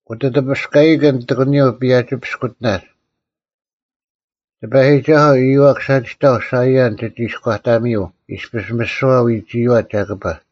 ᐅᑕᑕᐱᔅᑲᐃᑭᓐ ᑎᒂᓂᔪᐤ ᐸᔭᒋ-ᐱᔅᑯᑎᓇᒡ᙮ ᑎᐸᔨᒋᒐᓱᐤ ᐊᔪᐛᒃ ᓴᒋᑕᐤ ᓴᐃᔭᓐ ᒋᒋᐃᔎᑕᒥᔪᐤ ᐃᔅᐱᔅ ᒥᓯᐛ ᐎᒋᔨᐛ ᒐᑭᐸ᙮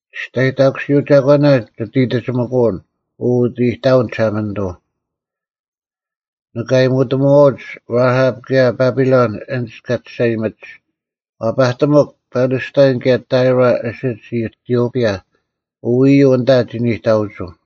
ᒋᔅᑕᔨᑕᑯᓯᐤ ᒐᒂᓇ ᒋᑦ ᐃᑕᒋᒥᑯᐅᓐ, ᐅ ᐅᑦ ᐃᑕᐅᓐ ᒋᓴᒪᓂᑐᐤ᙮ ᓂᑭ ᐊᔨᒧᑎᒪᐛᐅᒡ ᕋᐊᑉ ᑭᔭ ᐸᐱᓗᓐ ᐊᓐᒡ ᑲ ᒋᔅᒐᔨᒥᒡ: ᐛᐸᑎᒥᒄ ᐱᓕᔅᑕᐃᓐ, ᑭᔭ ᑕᐃᕐ, ᐊᓯᒡ ᐃᑎᔪᐱᔭ; “ᐅ ᐃᔪᐤ ᐊᓐᑕ ᒋ ᓂᑕᐅᒍᐤ᙮”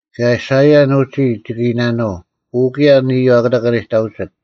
ᑭᔭ ᓴᐃᔭᓐ ᐅᒋ ᒋᑭ ᐃᓇᓄᐤ, “ᐅ ᑭᔭ ᐊᓐ ᐃᔪᐤ ᐊᑯᑕ ᑲ ᓂᑕᐅᒋᑦ:”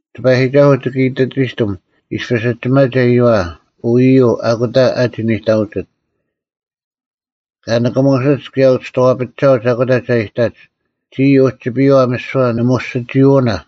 ᑎᐸᔨᒋᒐᓱᐤ ᒋᑭ ᐃᑕᒋᑎᒻ, ᐃᔅᐱ ᐊᒋᒪᒐ ᐃᔪᐛ, “ᐅ ᐃᔪᐤ ᐊᑯᑕ ᐊᒋ ᓂᑕᐅᒋᑦ᙮” ᑲ ᓂᑭᒧᓯᒡ ᑭᔭ ᐅᔍᐛᐱᒋᒐᐅᒡ ᐊᑯᑕ ᒐ ᐃᑕᒡ: “ᒋᔾ ᐅᒋᐱᔪᐛ ᒥᓯᐛ ᓂᒧᔅᒋᒋᐅᓇ᙮”